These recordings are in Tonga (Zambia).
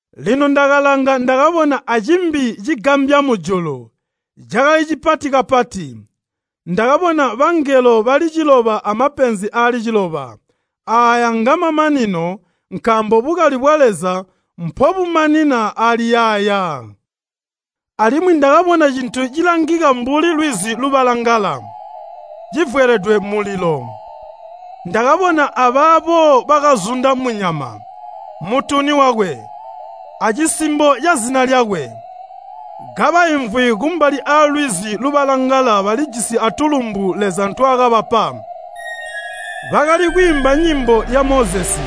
Lino ndakalanga ndakabona acimbi cigambya mujulu, cakali cipati kapati. Ndakabona bangelo bali ciloba amapenzi aali ciloba. Aaya ngaamamanino, nkaambo bukali bwa Leza mpobumanina ali yaaya. Alimwi ndakabona cintu cilangika mbuli lwizi lubalangala, civweledwe mulilo. Ndakabona abaabo bakazunda munyama, mutuni wakwe, acisimbo cazina lyakwe, kabaimvwi kumbali aalwizi lubalangala balijisi atulumbu Leza ntwaakabapa. Bakali kwiimba nyimbo ya Mozesi,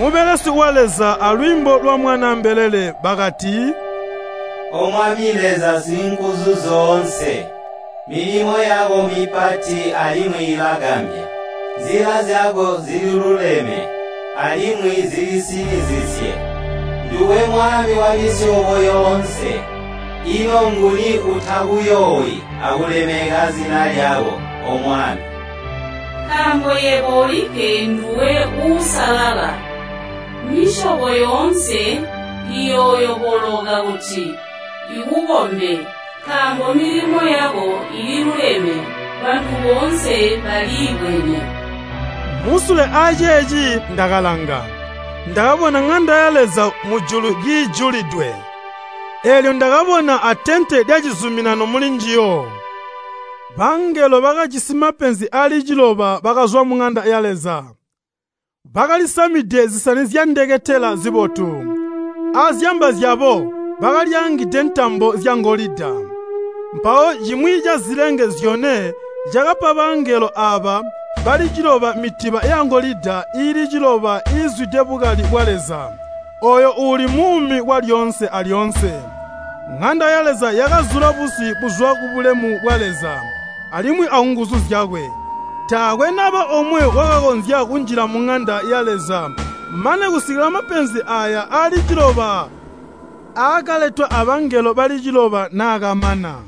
mubelesi wa Leza alwiimbo lwa Mwanaa mbelele bakati, “O Mwami Leza Singuzuzyoonse, milimo yako mipati alimwi ilagambya. Nzila zyako zililuleme, alimwi zilisinizizye. Nduwe Mwami wamisyobo yoonse. Ino nguni uutakuyoowi akulemeka zina lyako, O Mwami? Nkaambo yebo olikke nduwe Uusalala. Misyobo yoonse iyooyoboloka kuti ikukombe, nkaambo milimo yako iiluleme, bantu boonse baliibwene.” Musule aceeci, ndakalanga, ndakabona ŋanda ya Leza mujulu kiijulidwe, eelyo ndakabona atente lyacizuminano mulinjiyo. Bangelo bakajisi mapenzi aali ciloba bakazwa muŋanda ya Leza, bakalisamide zisani zyandeketela zibotu, azyamba zyabo bakalyaangide ntambo zyangolida. Mpawo cimwi cazilenge zyone cakapa bangelo aaba bali ciloba mitiba yangolida iili ciloba iizwide bukali bwa Leza, ooyo uuli muumi kwalyoonse alyoonse. Ŋanda ya Leza yakazula busi buzwa kubulemu bwa Leza alimwi akunguzu zyakwe. Taakwe naba omwe wakakonzya kunjila muŋanda ya Leza mane kusikila mapenzi aaya aali ciloba aakaletwa abangelo bali cibba naakamana.